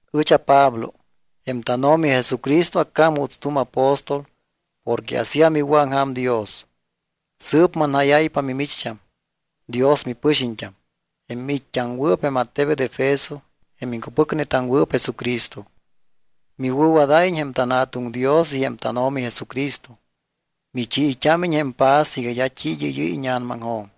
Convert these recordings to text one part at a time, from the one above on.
Ɨch aPablo. Jém tánO̱mi Jesucristo accám juuts tu̱m apóstol porque asíam iwɨ̱aŋja̱m Dios. Sɨɨp manjáyáypa mimicht́am, Dios mipɨxiñt́am, jém miit́t́aŋwɨɨp jém attebet Efeso jém iŋcupɨcnetaŋwɨɨp Jesucristo. Miwɨ̱wadáyiñ jém tanJa̱tuŋ Dios y jém tánO̱mi Jesucristo. Michiit́ámiñ jém paz iga d́a t́i id́ɨ́yɨ́y íña̱namaŋjo̱m.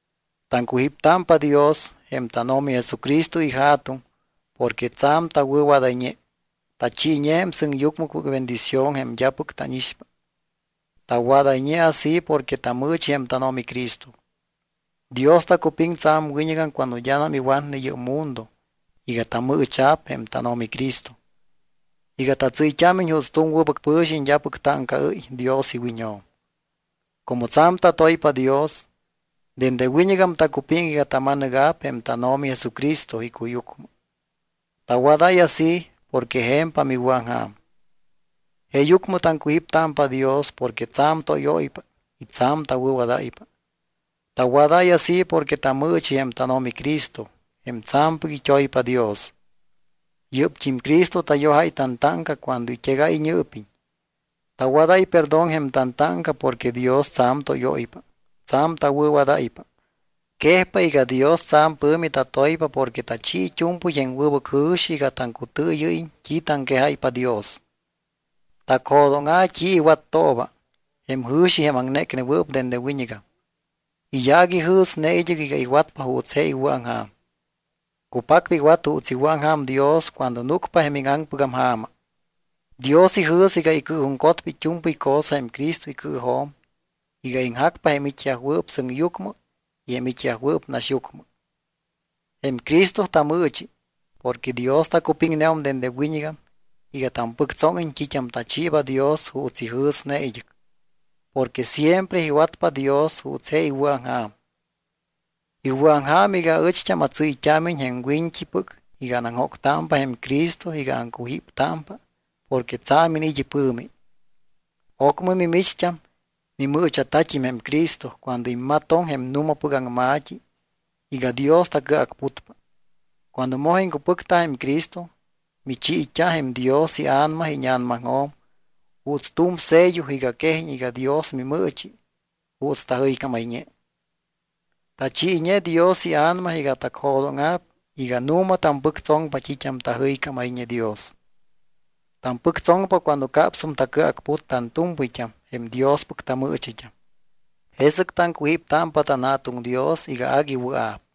Taŋcujíptámpa Dios, jém tánO̱mi Jesucristo iJa̱tuŋ, porque tsa̱m tawɨ̱wadayñe, tachiiñe jém sɨŋyucmɨpɨc bendición jém d́apɨc tánixpa. Tawadayñe así porque tamɨɨchi jém tánO̱mi Cristo. Dios tacupiŋ tsa̱m wiñɨgam cuando d́anam iwatne yɨ́p mundo iga tamɨɨcha̱p jém tánO̱mi Cristo, iga tatsɨ́yt́ámiñ juuts tu̱m wɨbɨc pɨ̱xiñ d́apɨc táŋcaɨ́y Dios iwiñjo̱m. Como tsa̱m tatoypa Dios, dende wiñɨgam tacupiŋ iga tama̱nɨga̱p jém tánO̱mi Jesucristo icuyucmɨ. Tawadáy así porque je̱mpam iwɨ̱aŋja̱m. Jeeyucmɨ taŋcujíptámpa Dios porque tsa̱m tóyóypa y tsa̱m tawɨ̱wadáypa. Tawadáy así porque tamɨɨchi jém tánO̱mi Cristo, jém tsa̱mpɨc it́oypa Dios. Yɨ́pt́im Cristo tayojáy tantáŋca cuando it́egáy iñɨɨpiñ. Tawadáy perdón jém tantáŋca porque Dios tsa̱m tóyóypa, tsa̱m tawɨ̱wadáypa. Quejpa iga Dios tsa̱m pɨ̱mi tatoypa porque tachi it́u̱mpɨy jém wɨbɨc jɨ̱xi iga taŋcutɨɨyɨ́yiñ t́i taŋquejáypa Dios. Tacjo̱dóŋa̱ t́i iwattooba, jém jɨ̱xi jém aŋnécnewɨɨp dende wiñɨgam. Iyaac ijɨ̱sne id́ɨc iga iwatpa juuts je iwɨ̱aŋja̱m. Cupacpa iwat juuts iwɨ̱aŋja̱m Dios cuando núcpa jém íŋaŋpɨgam ja̱ma. Dios ijɨ̱s iga icɨɨjuŋcotpa it́u̱mpɨy cosa jém Cristo icɨɨjo̱m iga iŋjacpa jém it́yajwɨɨp sɨŋyucmɨ y jém it́yajwɨɨp naxyucmɨ. Jém Cristo tamɨɨchi, porque Dios tacupiŋneum dende wiñɨgam iga tampɨctsóŋiñ t́it́am tachiiba Dios juuts ijɨ̱sne id́ɨc. Porque siempre iwatpa Dios juuts je iwɨ̱aŋja̱m. Iwɨ̱aŋja̱m iga aɨcht́am atsɨ́yt́ámiñ jém wiñt́ipɨc iga anaŋjóctámpa jém Cristo iga aŋcujíptámpa porque tsa̱m iniit́ ipɨ̱mi. Ocmɨ, mimicht́am, mimɨɨcha̱tat́im jém Cristo cuando immatoŋ jém nu̱mapɨc aŋma̱t́i iga Dios tacɨacputpa. Cuando moj iŋcupɨcta jém Cristo, michiit́a jém Dios iA̱nama íña̱namaŋjo̱m juuts tu̱m sello iga quejiñ iga Dios mimɨɨchi, juuts tajɨycámayñe. Tachiiñe Dios iA̱nama iga tacjo̱dóŋa̱p iga nu̱ma tampɨctsoŋpa t́it́am tajɨycámayñe Dios. Tampɨctsoŋpa cuando capsum tacɨacput tantu̱mpɨyt́am jém Diospɨc tamɨɨchit́am. Jesɨc taŋcujíptámpa tanJa̱tuŋ Dios iga agui wɨa̱p.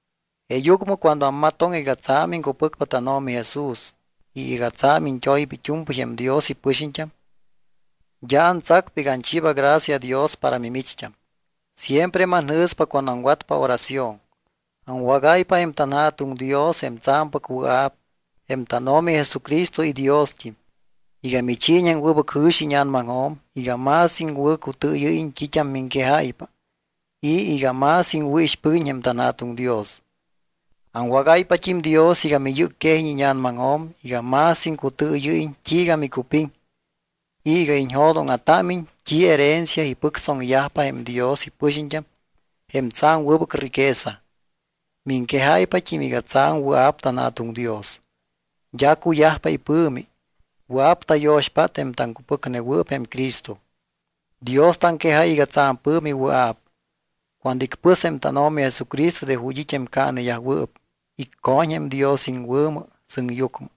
Jeeyucmɨ cuando ammatoŋ iga tsa̱m iŋcupɨcpa tánO̱mi Jesús y iga tsa̱m iñt́oypa it́u̱mpɨy jém Dios ipɨxiñt́am, d́a antsacpa iga anchiiba gracia Dios para mimicht́am. Siempre manjɨ̱spa cuando aŋwatpa oración. Aŋwágáypa jém tanJa̱tuŋ Dios, jém tsa̱mpɨc wɨa̱p, jém tánO̱mi Jesucristo iDiost́im, iga michiiñ jém wɨbɨc jɨ̱xi íña̱namaŋjo̱m iga más iŋwɨ̱cutɨɨyɨ́yiñ t́it́am miŋquejáypa y iga más iŋwɨ̱ixpɨguiñ jém tanJa̱tuŋ Dios. Aŋwagáypat́im Dios iga miyɨ́cquejiñ íña̱namaŋjo̱m iga más iŋcutɨɨyɨ́yiñ t́iiga micupiŋ y iga iñjo̱dóŋa̱támiñ t́i herencia ipɨctsoŋyajpa jém Dios ipɨxiñt́am jém tsa̱m wɨbɨc riquesa. Miŋquejáypat́im iga tsa̱m wɨa̱p tanJa̱tuŋ Dios. D́a cuyajpa ipɨ̱mi, wɨa̱p tayo̱xpát jém taŋcupɨcnewɨɨp jém Cristo. Dios taŋquejáy iga tsa̱m pɨ̱mi wɨa̱p cuando icpɨs jém tánO̱mi Jesucristo de ju̱t́ it́ jém caaneyajwɨɨp, icco̱ñ jém Dios iŋwɨ̱mɨ sɨŋyucmɨ.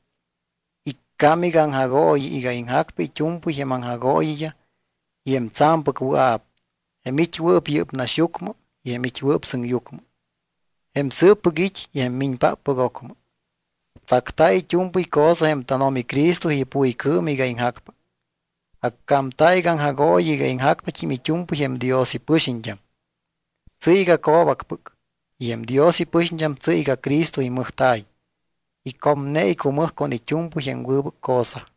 Iccám iga aŋjagooyi iga iŋjacpa it́u̱mpɨy jém aŋjagooyiyaj y jém tsa̱mpɨc wɨa̱p, jém it́wɨɨp yɨ́p naxyucmɨ y jém it́wɨɨp sɨŋyucmɨ. Jém sɨɨppɨc it́ y jém miñpáppɨc ocmɨ. Tsacta̱ it́u̱mpɨy cosa jém tánO̱mi Cristo ipuycɨɨm iga iŋjacpa. Accámta̱ iga aŋjagooyi iga iŋjacpat́im it́u̱mpɨy jém Dios ipɨxiñt́am. Tsɨ́y iga co̱bacpɨc. Y jém Dios ipɨxiñt́am tsɨ́y iga Cristo imɨjta̱y, icomne icumɨj con it́u̱mpɨy jém wɨbɨc cosa.